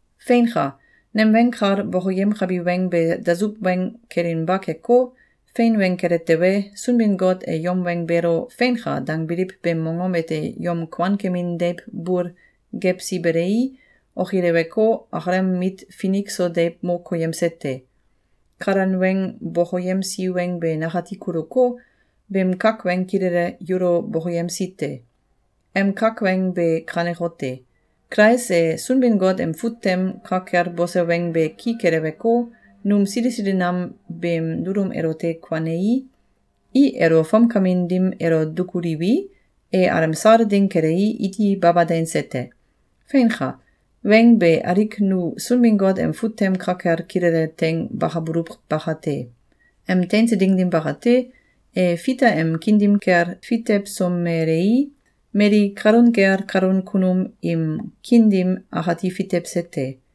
Feinka! Nem weng kal bokoyemkabi weng be dasuw weng kelinba keko, fein weng kele tewe, Sunbin-Got e yom weng beelo “Feinka!”, dangbiliw beem mongom ete yom kuankemin deiw bul gewsi belei, okileweko, akalem mit finik so deiw mo koyemse te. Kalan weng bokoyemsi weng be nakati kuluko, beem kak weng kilele yulo bokoyemsi te. Em kak weng be kanekote: Kulais e Sunbin-Got em fut tem ka kel bose weng be ki keleweko, num sili sili nam beem dulum elote kuanei, i elo fomkamin dim elo dukuliwi, e alemsal ding kelei, iti baba teinse te. Feinka! Weng be alik nu Sunbin-Got em fut tem ka kel kilele teing bakabululw bakate! Em teinse ding dim bakate, e Fita em kiin dim kel fitewsomelei, mali kalun kel kalan kunum im kiin dim akati fitewse te.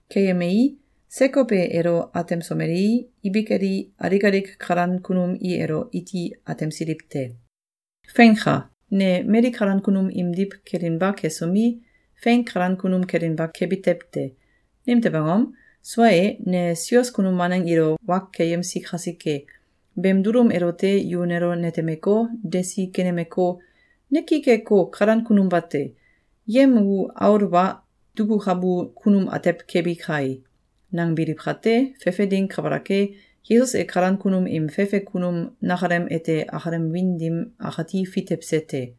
Keyemei, Sekow e elo atemsomelei, ibik eli, alik alik kalan kunum i elo iti atemsiliw te. Feinka! Ne mali kalan kunum imdiw kelinba kesomi, fein kalan kunum kelinba kebi tew te! Nimtew angom? Sua e, ne sios kunum waneng ilo wa keyemsi kasike. Beem dulum elote yu nelo netemeko, desi kenemeko, “Ne ki keko, kalan kunum bate! Yem u aul wa dukukabu kunum atew kebi kae!”, nangbiliw kate, fefe ding kabalak e, Yesus e kalan kunum im fefe kunum nakalem ete akalem wiin dim akati fitewse te.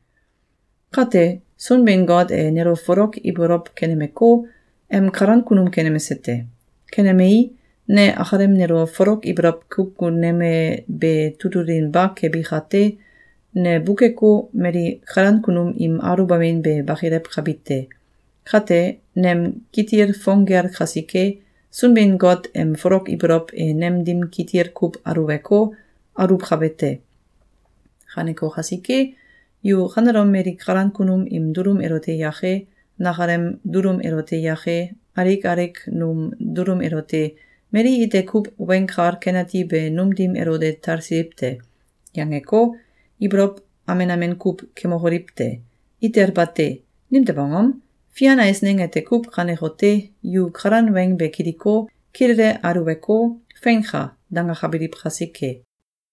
Kate, Sunbin-Got e nelo folok ibolow kenemeko, em kalan kunum kenemse te. Kenemei, ne akalem nelo folok ibolow kukuneme be tutulinba kebi kate, ne bukeko, mali kalan kunum im aluwbamin be bakilewkabi te. Kate, nem kitil fong gel kasike, Sunbin-Got em folok ibolow e nem dim kitil kuw aluweko, aluwkabe te. Kaneko kasike, yu kanelom mali kalan kunum im dulum elote yake, nakalem dulum elote yake, alik alik num dulum elote “Mali ite kuw Weng Kal Ken Ati be num dim elo de talsiliw te!”, yangeko, ibolow amen amen kuw kemokoliw te! Itel bate! Nimtew angom? Fian eisneng ete kuw kanekote: Yu kalan weng be kiliko, kilele aluweko, “Feinka!”, dangakabiliw kasike.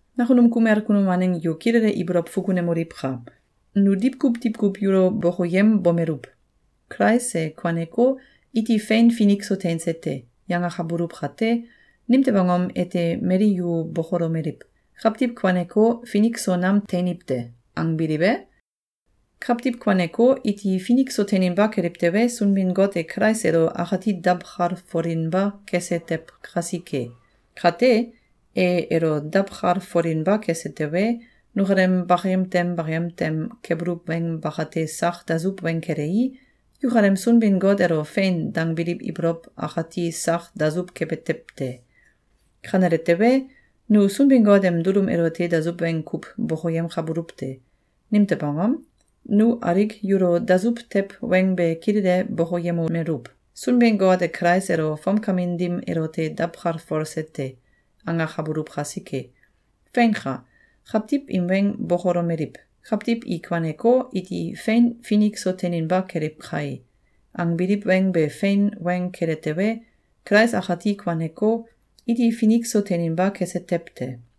Nakunum kumel kunum waneng yu kilele ibolow fukunemoliwka! Nu diwkuw diwkuw yulo bokoyembomeluw: “Kulais e kuaneko, iti fein finik so teinse te!”, yangakabuluw kate, nimtew angom ete mali yu bokolomeliw: “Kawtiw kuaneko, finik so nam teiniw te!”, angbiliw e? Kawtiw kuaneko, iti finik so teininba keliw tewe, Sunbin-Got e Kulais elo akati dawkalfolinba kese tew kasike. Kate, e elo dawkalfolinba kese tewe, nukalem bakayem tem bakayem tem kebuluw weng bakate sak dasuw weng kelei, yukalem Sunbin-Got elo “Fein!”, dangbiliw ibolow akati sak dasuw kebe tew te. Kanele tewe, nu Sunbin-Got em dulum elote dasuw weng kuw bokoyemkabuluw te. Nimtew angom? Nu alik yulo dasuw tew weng be kilele bokoyemomeluw: “Sunbin-Got e Kulais elo fomkamin dim elote dawkalfolse te!”, angakabuluw kasike. Feinka! Kawtiw im weng bokolomeliw: “Kawtiw i kuaneko, iti fein finik so teininba keliw kae!”, angbiliw weng be fein weng kele tewe, Kulais akati kuaneko, iti finik so teininba kese tew te.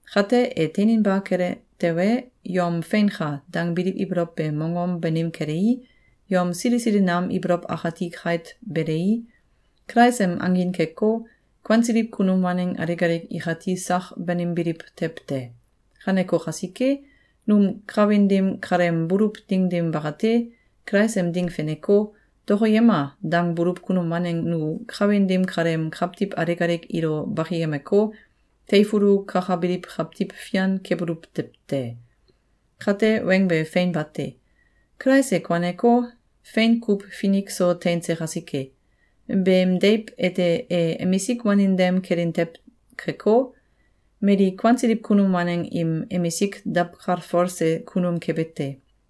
Kate, e teininba kele tewe, yom “Feinka!”, dangbiliw ibolow be mongom banim kelei, yom sili sili nam ibolow akati kait belei, Kulais em angin keko, kuansiliw kunum waneng alik alik ikati sak banimbiliw tew te. Kaneko kasike, num kawin dim kaleem buluw ding dim bakate, Kulais em ding feneko, “Dokoyema!”, dangbuluw kunum waneng nu kawin dim kaleem kawtiw alik alik ilo bakiyemeko, teifulu kakabiliw kawtiw fian kebuluw tew te. Kate weng be fein bate! Kulais e kuaneko, fein kuw finik so teinse kasike. Beem deiw ete e emisik wanin dem kelin tew keko, mali kuansiliw kunum waneng im emisik dawkalfolse kunum kebe te.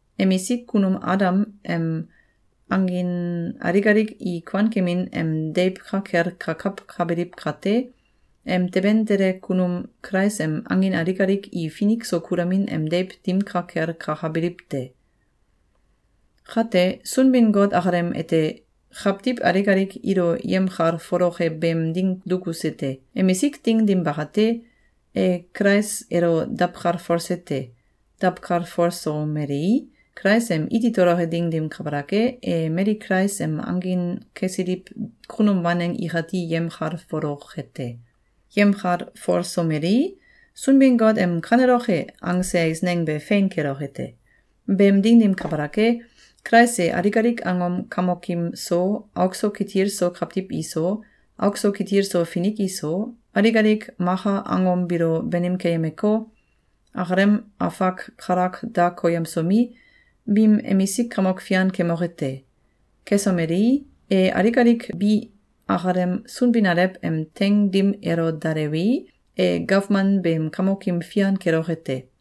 Emisik kunum Adam em angin alik alik i kuankemin em deiw ka kel kakawkabiliw kate, em teben tele kunum Kulais em angin alik alik i finik so kulamin em deiw dim ka kel kakabiliw te. Kate, Sunbin-Got akalem ete kawtiw alik alik ilo yemkalfoloke beem ding dukuse te. Emisik ding dim bakate, e Kulais elo dawkalfolse te. Dawkalfolsomelei, Kulais em iti toloke ding dim kabalak e, e mali Kulais em angin kesiliw kunum waneng ikati yemkalfoloke te. Yemkalfolsomelei, Sunbin-Got em “Kaneloke!”, angse eisneng be fein keloke te. Beem ding dim kabalak e, Kulais e alik alik angom kamokim so, auk so kitil so kawtiw iso, auk so kitil so finik iso, alik alik maka angom biilo banim keyemeko, akalem afak kalak da koyemsomi, biim emisik kamok fian kemoke te. Kesomelei, e alik alik bi akalem Sunbin-Alew em teing dim elo dalewei, e gawman beem kamokim fian keloke te.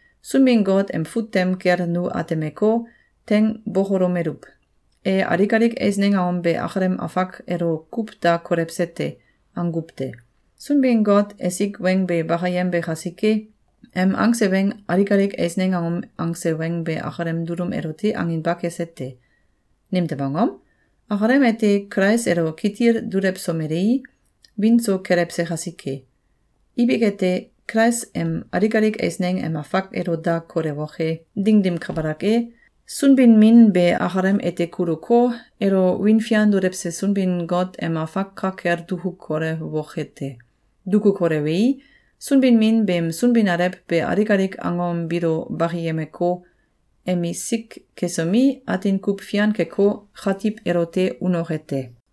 Sunbin-Got em fut tem kel nu atemeko, teing bokolomeluw: “E alik alik eisneng angom be akalem afak elo kuw da kolewse te.”, anguw te. (Sunbin-Got esik weng be bakayembe kasike, em angse weng Alik alik eisneng angom angse weng be akalem dulum elote anginba kese te. Nimtew angom? Akalem ete Kulais elo kitil dulewsomelei, wiin so kelewse kasike.) Ibik ete, Kulais em alik alik eisneng em afak elo da kolewoke ding dim kabalak e, Sunbin-Min be akalem ete kuluko, elo wiin fian dulewse Sunbin-Got em afak ka kel duku kolewoke te. Duku kolewei, Sunbin-Min beem Sunbin-Alew be alik alik angom biilo bakiyemeko, emisik kesomi, atin kuw fian keko, katiw elote unoke te.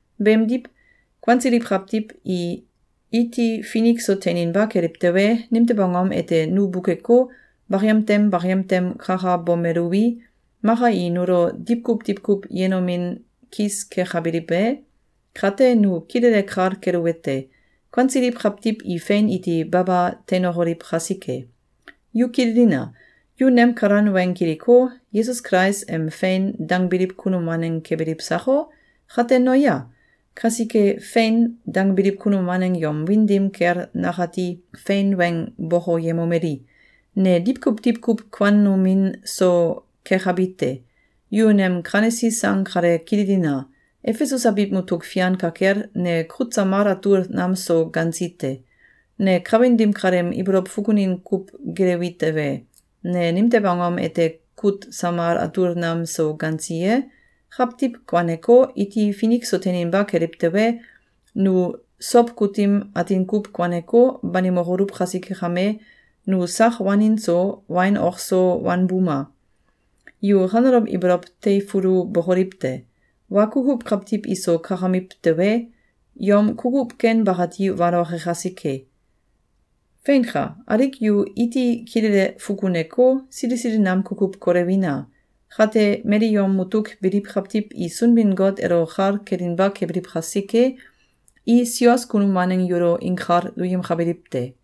Beemdiw, kuansiliw kawtiw i iti finik so teininba keliw tewe, nimtew angom ete nu bukeko, bakayem tem bakayem tem kakabomeluwi, maka i nulo diwkuw diwkuw yenomin kis kekabiliw e? Kate nu kilele kal keluwete: Kuansiliw kawtiw i fein iti baba teinokoliw kasike! Yu kililina! Yu nem kalan weng kiliko, Kulais Yesus em “Fein!”, dangbiliw kunum waneng kebiliw sako? Kate noya! Kasike, “Fein!”, dangbiliw kunum waneng yom wiin dim kel nakati fein weng bokoyemomeli: Ne diwkuw diwkuw kuanomin so kekabi te. Yu nem kanesi sang kale kililina! Efesus abiw mutuk fian ka kel, ne kut samal atul nam so gansi te. Ne kawin dim kaleem ibolow fukunin kuw gelewi tewe, ne nimtew angom ete kut samal atul nam so gansi ye? Kawtiw kuaneko, iti finik so teininba keliw tewe, nu Sow kutim atin kuw kuaneko, banimokoluw kasike kame, nu sak wanin so, wain ok so wanbuma! Yu kanelom ibolow teifulubokoliw te! “Wa kukuw kawtiw iso kakamiw tewe, yom kukuw ken bakati waloke kasike!” Feinka! Alik yu iti kilele fukuneko, sili sili nam kukuw kolewina! Kate mali yom mutuk biliw kawtiw i Sunbin-Got elo kal kelinba kebiliw kasike, i sios kunum waneng yulo inkal duyemkabiliw te.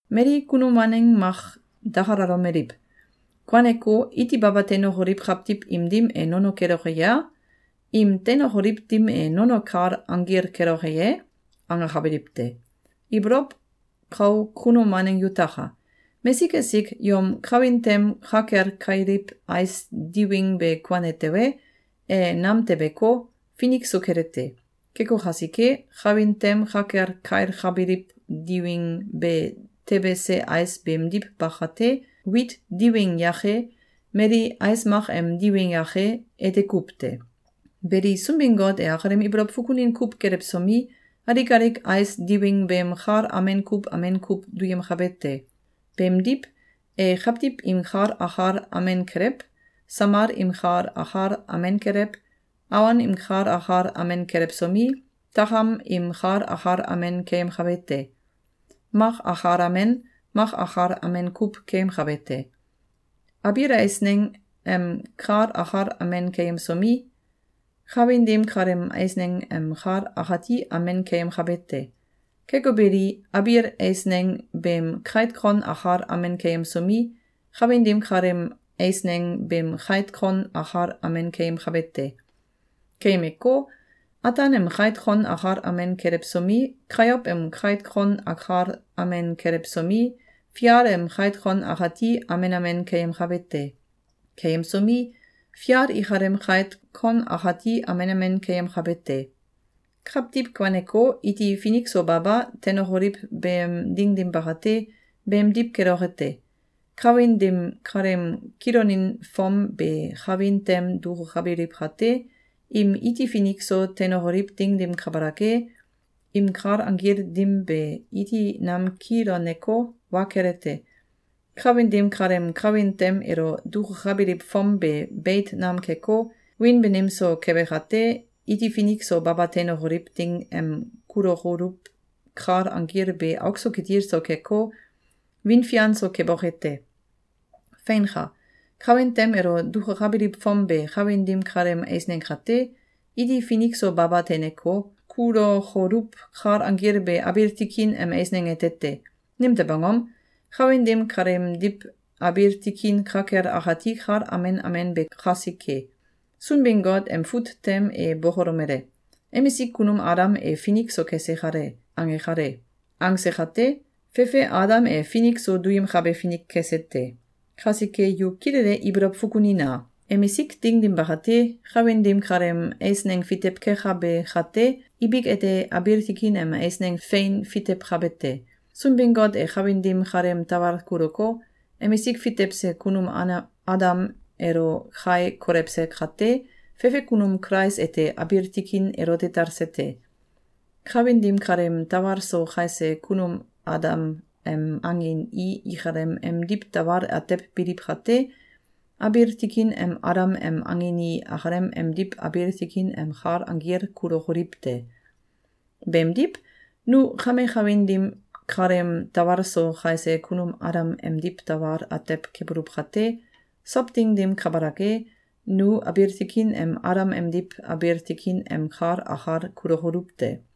Mali kunum waneng mak dakalalomeliw: “Kuaneko, iti baba teinokoliw kawtiw im dim e nono keloke ye? Im teinokoliw dim e nono kal anggil keloke ye?”, angakabiliw te. Ibolow kau kunum waneng yutaka! Mesik esik yom kawin tem ka kel kailiw ais diwing be kuane tewe, e nam tebeko, finik so kele te. Keko kasike, kawin tem ka kel kailkabiliw diwing be tebese ais beemdiw ba kate, wit diwing yake, mali ais mak em diwing yake, ete kuw te. Beli, Sunbin-Got e akalem ibolow fukunin kuw gelewsomi, alik alik ais diwing beem kal amen kuw amen kuw duyemkabe te. Beemdiw, e kawtiw im kal akal amen kelew, samal im kal akal amen kelew, awon im kal akal amen kelewsomi, takam im kal akal amen keyemkabe te. Mak akal amen, mak akal amen kuw keyemkabe te. Abiil eisneng em kal akal amen keyemsomi, kawin dim kaleem eisneng em kal akati amen keyemkabe te. Keko beli, abiil esieng beem kait kon akal amen keyemsomi, kawin dim kaleem eisneng beem kait kon akal amen keyemkabe te. Keyemeko, ataan em kait kon akal amen kelewsomi, kayow em kait kon akal amen kelewsomi, fial im kait kon akati amen amen keyemkabe te. Keyemsomi, fial ikalem kait kon akati amen amen keyemkabe te. Kawtiw kuaneko, iti finik so baba teinokoliw beem ding dim bakate, beemdiw keloke te. Kawin dim kaleem kilonin fom be kawin tem dukukabiliw kate, im iti finik so teinokoliw ding dim kabalak e, im kal anggil dim be iti nam kiloneko, wa kele te. Kawin dim kaleem kawin tem elo dukukabiliw fom be beit nam keko, wiin banim so kebe kate, iti finik so baba teinokoliw ding em kulokoluw kal anggil be auk so kitil so keko, wiin fian so keboke te. Feinka! Kawin tem elo dukukabiliw fom be kawin dim kaleem eisneng kate, iti finik so baba teineko, kulokoluw kal anggil be abiil tikin em eisneng ete te. Nimtew angom? Kawin dim kaleemdiw abiil tikin ka kel akati kal amen amen be kasike. Sunbin-Got em fut tem e bokolomele: “Emisik kunum Adam e finik so kese kale!”, ange kale. Angse kate, fefe Adam e finik so duyemkabe finik kese te. Kasike yu kilele ibolow fukunina! Emisik ding dim bakate, kawin dim kaleem eisneng fitew kekabe kate, ibik ete abiil tikin em eisneng fein fitewkabe te. Sunbin-Got e kawin dim kaleem tawal kuluko, emisik fitewse kunum Adam elo kai kolewse kate, fefe kunum Kulais ete abiil tikin elote talse te. Kawin dim kaleem tawal so kaise kunum Adam em angin i akalem emdiw tawal atew biliw kate, abiil tikin em Adam em angin i akalem emdiw abiil tikin em kal anggil kulokoliw te. Beemdiw, nu kame kawin dim kaleem tawal so kaise kunum Adam emdiw tawal atew kebuluw kate, sow ding dim kabalak e, nu abiil tikin em Adam emdiw abiil tikin em kal akal kulokoluw te.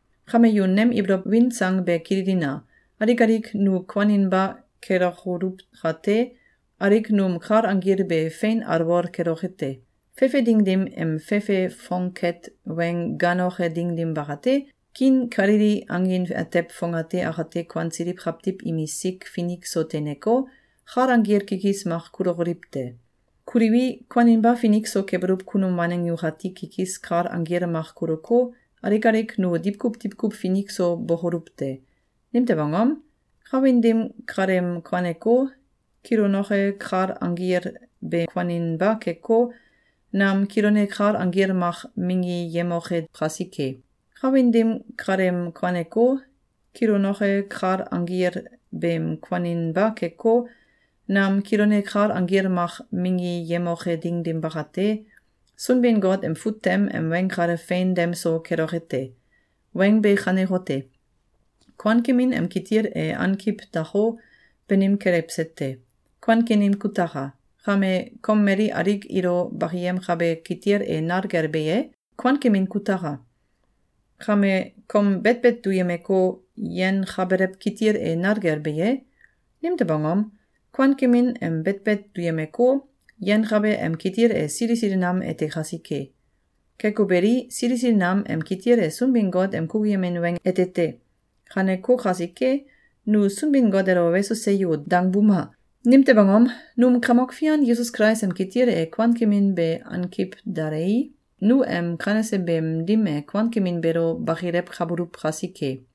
Kame yu nem ibolow win sang be kililina! Alik alik nu kuaninba lekokoluw kate, alik num kal anggil be fein alwol keloke te. Fefe ding dim em fefe fongket weng gaanoke ding dim bakate, kiin kalili angin atew fongate akate kuansiliw kawtiw imisik finik so teineko, kal anggil kikis mak kulokoliw te. Kuliwi, kuaninba finik so kebuluw kunum waneng nukati kikis kal anggil mak kuluko, alik alik nu diwkuw diwkuw finik so bokoluw te. Nimtew angom? Kawin dim kaleem kuanko, kilonoke kal anggil be kuaninba keko, nam kilone kal anggil mak minggiyemoke kasike. Kawin dim kaleem kuaneko, kilonoke kal anggil beem kuaninba keko, nam kilone kal anggil mak minggiyemoke ding dim bakate, Sunbin-Got em fut tem em weng kale fein dem so keloke te. Weng be kanekote: “Kuankemin em kitil e ankiw dako, banim kelewse te. Kuankemin kutaka! Kame, kom mali alik ilo bakiyemkabe kitil e nal kel be ye? Kuankemin kutaka! Kame, kom betbet duyemeko, yenkabelew kitil e nal kel be ye?” Nimtew angom? Kuankemin em betbet duyemeko, yenkabe em kitil e sili sili nam ete kasike. Keko beli, sili sili nam em kitil e Sunbin-Got em kukuyemin weng ete te. Kaneko kasike, nu Sunbin-Got elo “Weso! Seyo!”, dangbuma! Nimtew angom? Num Kamok Fian Yesus Kulais em kitil e kuankemin be ankiw dalei, nu em kanese beem dim e kuankemin beelo bakilewkabuluw kasike.